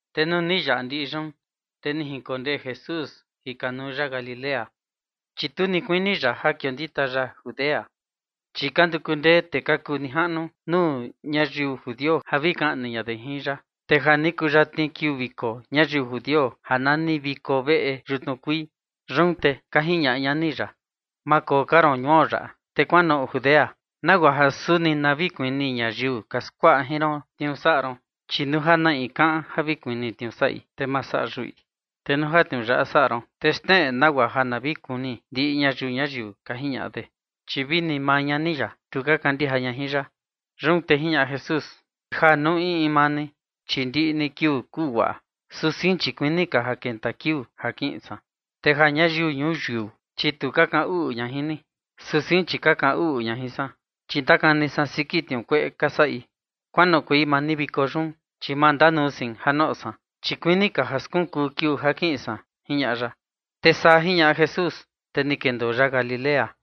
Te nuu ni yaꞌa ndiꞌi yun, te ni jinkondee Jesús jikanuu ya Galilea. Chi tu ni kuini ya ja kiondita ya Judea, chi ka nduku ndee tee ka kuu nijaꞌnu nuu ñayiu judio ja vi kaꞌni ña de jin ya. Te ja ni kuyatni kiuu viko ñayiu judio ja nani viko veꞌe xtnuu kuii. Yun te ka jiñaꞌa ñani ya: ―Ma koo ka ron ñuo yaꞌa, te kuanoꞌo Judea, nagua ja suni na vi kuni ñayiu ka skuaꞌa jin ron tniuu saꞌa ron. Chi nuu ja na in kaꞌan ja vi kuni tniuu saꞌi, te ma saꞌa yuꞌi. Te nuu ja tniuu yaꞌa saꞌa ron, te xneꞌe nagua ja na vi kuni ndiꞌi ñayiu ñuyiu ―ka jiñaꞌa de. Chi vini maa ñani ya, tu ka kandija ña jin ya. Yun te jiñaꞌa Jesús: ―Ja nuu in in maa ni, chi ndiꞌi ni kiuu kuu guaꞌa, su sein chi kuini ka ja kenta kiuu ja kiꞌin san. Te ja ñayiu ñuyiu, chi tu ka kaꞌan uꞌu ña jin ni, su sein chi ka kaꞌan uꞌu ña jin san, chi ndakani san siki tniuu kueꞌe ka saꞌi. Kuanoꞌokuei maa ni viko yun, chi ma ndanuu sein ja noꞌo san, chi kuini ka ja skunkuu kiuu ja kiꞌin san ―jiñaꞌa ya. Te saa jiñaꞌa Jesús, te ni kendoo ya Galilea.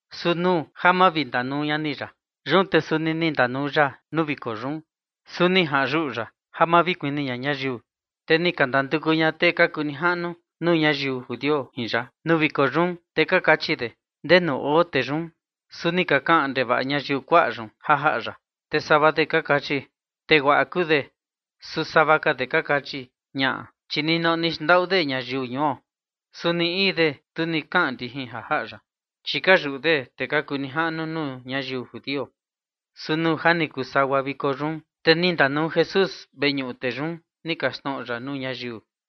Su nuu ja mavindanuu ñani ya, yun te suni ni ndanuu ya nuu viko yun, su ni jaꞌan yuꞌu ya ja ma vi kuni ña ñayiu. Te ni ka ndanduku ña tee ka kuu nijaꞌnu nuu ñayiu judio jin ya nuu viko yun, te ka kachi de: ―¿Ndenu oo tee yun? Su ni ka kaꞌan ndevaꞌa ñayiu kuaꞌa yun ja jaꞌa ya, te sava de ka kachi: “Tee guaꞌa kuu de”. Su sava ka de ka kachi: “Ñaꞌa, chi ninoꞌo ni xndaꞌu de ñayiu ñuo”. Su ni in de, tu ni kaꞌan ndijin ja jaꞌa ya, chi ka yuꞌu de tee ka kuu nijaꞌnu nuu ñayiu judio. Su nuu ja ni kuu sagua viko yun, te ni ndanuu Jesús veñuꞌu, te yun ni kaxtnoꞌo ya nuu ñayiu.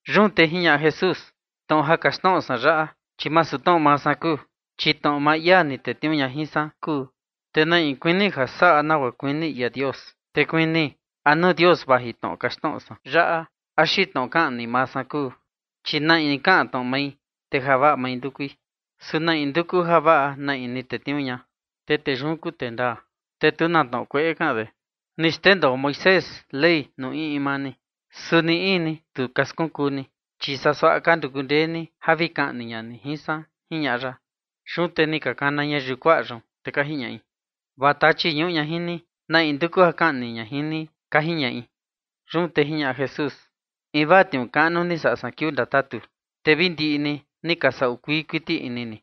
Yun te jiñaꞌa Jesús: ―Tnoꞌo ja kaxtnoꞌo san yaꞌa, chi masu tnoꞌo maa san kuu, chi tnoꞌo maa ia ni tetniuu ña jin san kuu. Te na in kuini ja saꞌa nagua kuini ia Dios, te kuni a nuu Dios vaji tnoꞌo kaxtnoꞌo san yaꞌa axi tnoꞌo kaꞌan ni maa san kuu. Chi na in kaꞌan tnoꞌo mai, te javaꞌa mai ndukui. Su na in nduku javaꞌa na in ni tetniuu ña, te tee yun kuu tee ndaa, te tu na tnoꞌo kueꞌe kaꞌan de. Ni xndendoo Moisés Ley nuu in in maa ni, su ni in ni tu ka skunkuu ni, chi saa suaꞌa ka nduku ndee ni ja vi kaꞌni ña ni jin san ―jiñaꞌa ya. Yun te ni ka kana ñayiu kuaꞌa yun, te ka jiñaꞌi: ―Vaa tachi ñuꞌu ña jin ni, ¿na in nduku ja kaꞌni ña jin ni? ―ka jiñaꞌi. Yun te jiñaꞌa Jesús: ―Invaa tniuu kaꞌnu ni saꞌa san kiuu ndatatu, te vi ndiꞌi ni ni ka saꞌu kuii kuiti ini ni.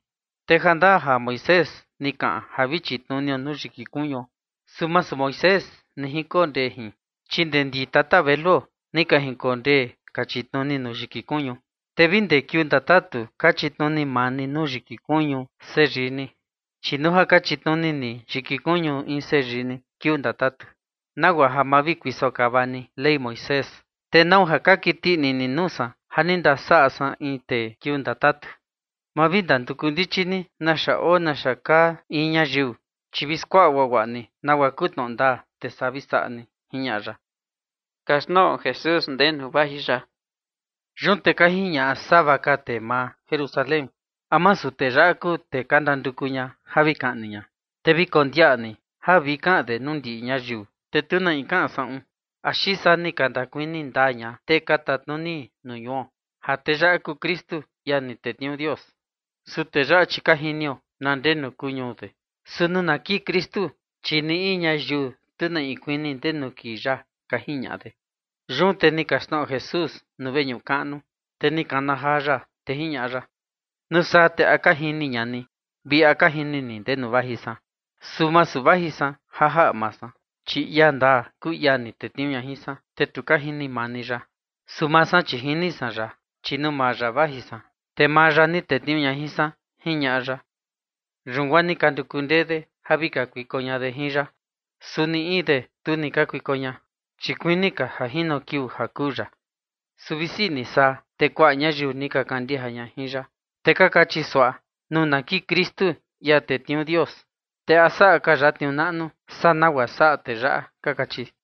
Te jandaa ja Moisés ni kaꞌan ja vi chitnunio nuu yiki kuñuo, su masu Moisés ni jinkondee jin, chi ndee ndi tata veluo ni ka jinkondee ka chitnuni nuu yiki kuñu, te vi ndee kiuu ndatatu ka chitnuni maa ni nuu yiki kuñu seyii ni. Chi nuu ja ka chitnuni ni nuu yiki kuñu in seyii ni kiuu ndatatu, nagua ja ma vi kuiso kava ni Ley Moisés, ¿te nau ja ka kiti ini ni nuu san ja ni ndasavaꞌa san in tee kiuu ndatatu? Ma vi ndanduku ndichi ni naxa oo naxa kaa in ñayiu, chi vi skuaꞌa guaguaꞌa ni nagua kuu ndaa, te saa vi saꞌa ni ―jiñaꞌa ya. Yun te ka jiñaꞌa sava ka tee maa Jerusalén: ―¿A masu tee yaꞌa kuu tee ka ndanduku ja vi kaꞌni? Te vi kondiaꞌa ni ja vi kaꞌan de jin nuu ndiꞌi ñayiu, te tu na in kaꞌan saꞌun, axi saa ni ka ndakuni ndaa ña tee ka tatnuni nuu ñuo ja tee yaꞌa kuu Kristu, ia ni tetniuu Dios. Su tee yaꞌa, chi ka jinio na ndenu kuu ñuu de. Su nuu na kii Kristu, chi ni in ñayiu tu na in kuni ndenu kii ya ―ka jiñaꞌa de. Yun te ni kaxtnoꞌo Jesús nuu veñuꞌu kaꞌnu, te ni kana jaa ya, te jiñaꞌa ya: ―¿Nuu saa te a ka jini ña ni vi a ka jini ni ndenu vaji san? Su masu vaji san ja jaꞌa maa san, chi ia ndaa kuu ia ni tetniuu ña jin san, te tu ka jini maa ni ya. Su maa san, chi jini san ya, chi nuu maa ya vaji san, te maa ya ni tetniuu ña jin san ―jiñaꞌa ya. Yun guaa ni ka nduku ndee de ja vi kakuiko ña de jin ya. Su ni in de tu ni kakuiko ña, chi kuini ka ja jino kiuu ja kuu ya. Su visi ni saa, te kuaꞌa ñayiu ni ka kandija ya, te ka kachi: ―Nuu na kii Kristu, ia tetniuu Dios, te ¿a saꞌa ka ya tniuu naꞌnu saa nagua saꞌa tee yaꞌa? ―ka kachi.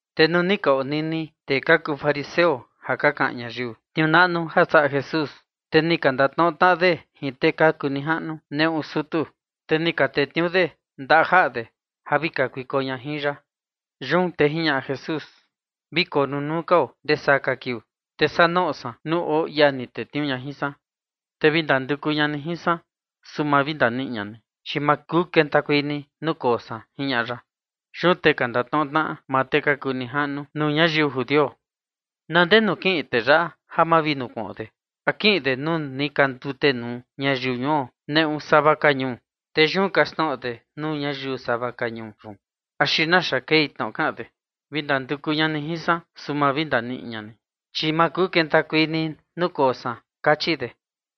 Te nuu ni ka onini tee ka kuu fariseo ja ka kaꞌan ñayiu tniuu naꞌnu ja saꞌa Jesús, te ni ka ndatnoꞌo tnaꞌa de jin tee ka kuu nijaꞌnu nuu sutu, te ni ka tetniuu de ndajaꞌa de ja vi kakuiko ña jin ya. Yun te jiñaꞌa Jesús: ―Vi koo nunuu kao ndesaa ka kiuu, te saa noꞌo san nuu oo ia ni tetniuu ña jin san. Te vi ndanduku ña ni jin san, su ma vi ndaniꞌi ña ni, chi ma kuu kentakuei ni nuu koo san ―jiñaꞌa ya. Yun te ka ndatnoꞌo tnaꞌa maa tee ka kuu nijaꞌnu nuu ñayiu judio: ―¿Na ndenu kiꞌin tee yaꞌa ja ma vi nukuꞌon de? ¿A kiꞌin de nuu ni ka ndutenuu ñayiu ñuo neꞌu sava ka ñuu, te yun kaxtnoꞌo de nuu ñayiu sava ka ñuu yun? ¿Axi naxa kei tnoꞌo kaꞌan de: “Vi ndanduku ña ni jin san, su ma vi ndaniꞌi ña ni, chi ma kuu kentakuei ni nuu koo san”? ―ka kachi de.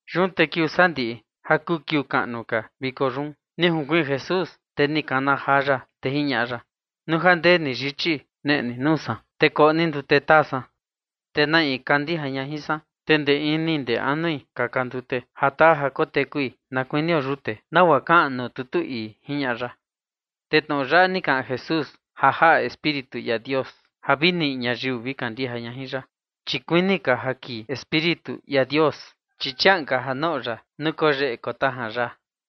Yun te kiuu sandiꞌi ja kuu kiuu kaꞌnu ka viko yun, ni junkuiin Jesús, te ni kana jaa ya, te jiñaꞌa ya: ―Nuu ja ndee ni yichi, neꞌe ni nuu san, te koꞌo ni ndute taa san, te na in kandija ña jin san, te ndee ini ndee anui kaka ndute ja taa ja kotekui na kuinio yute nagua kaꞌan nuu tutu ii ―jiñaꞌa ya. Te tnoꞌo yaꞌa ni kaꞌan Jesús ja jaꞌa Espíritu ia Dios ja vi niꞌi ñayiu vi kandija ña jin ya, chi kuini ka ja kii Espíritu ia Dios, chi chiaꞌan ka ja noꞌo ya nuu yeꞌe tajan ya.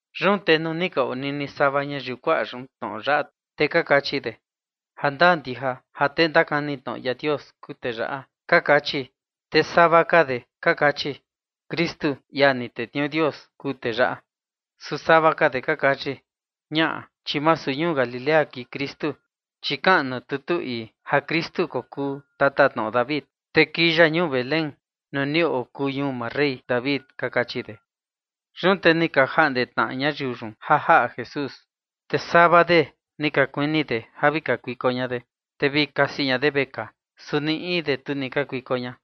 Yun te nuu ni ka onini sava ñayiu kuaꞌa yun tnoꞌo yaꞌa, te ka kachi: ―Jandaa ndija ja tee ndakani tnoꞌo ia Dios kuu tee yaꞌa ―ka kachi. Te sava ka de ka kachi: ―Kristu, ia ni tetniuu Dios, kuu tee yaꞌa. Su sava ka de ka kachi: ―Ñaꞌa, chi masu ñuu Galilea kii Kristu. Chi kaꞌan nuu tutu ii ja Kristu kokuu tatatnoꞌo David, te kii ya ñuu Belén nuu ni okuu ñuu maa rey David ―ka kachi de. Yun te ni ka jaꞌnde tnaꞌa ñayiu yun ja jaꞌa Jesús. Te sava de ni ka kuini de ja vi kakuiko ña de, te vi kasi ña de vekaa, su ni in de tu ni kakuiko ña.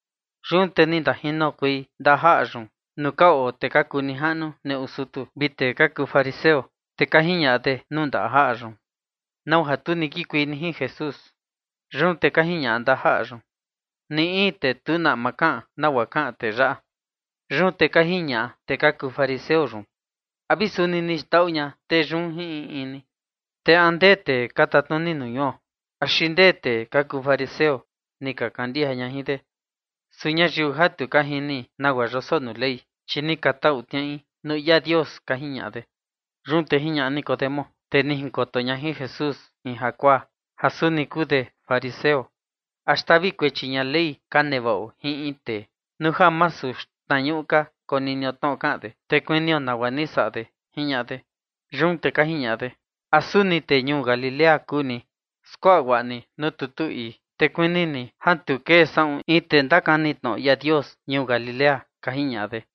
Yun te ni ndajinokuei ndajaꞌa yun nuu ka oo tee ka kuu nijaꞌnu nuu sutu vi tee ka kuu fariseo, te ka jiñaꞌa de nuu ndajaꞌa yun: ―¿Nau ja tu ni kikuei ni jin Jesús? Yun te ka jiñaꞌa ndajaꞌa yun: ―Ni in tee tu na ama kaꞌan nagua kaꞌan tee yaꞌa. Yun te ka jiñaꞌa fariseo yun: ―¿A vi suni ni xndaꞌu ña tee yun jin in in ni? Te ¿a ndee tee ka tatnuni nuu ñuo axi ndee tee ka kuu fariseo ni ka kandija ña jin de? Su ñayiu ja tu ka jini nagua yoso nuu Ley, chi ni ka tau tniaꞌai nuu ia Dios ―ka jiñaꞌa de. Yun te jiñaꞌa Nicodemo, tee ni jinkoto ña jin Jesús in jakuaa, ja suni kuu de fariseo: ―¿A xtavi kuechi ña Ley ka nevaꞌo jin in tee, nuu ja masu xtnañuꞌu ka koninio tnoꞌo kaꞌan de, te kunio nagua ni saꞌa de? ―jiñaꞌa de. Yun te ka jiñaꞌa de: ―¿A suni tee ñuu Galilea kuu ni? Skuaꞌa guaꞌa ni nuu tutu ii, te kuni ni ja tu kee saꞌun in tee ndakani tnoꞌo ia Dios ñuu Galilea ―ka jiñaꞌa de.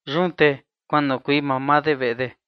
[Yun te kuanoꞌokuei mamaa de veꞌe de.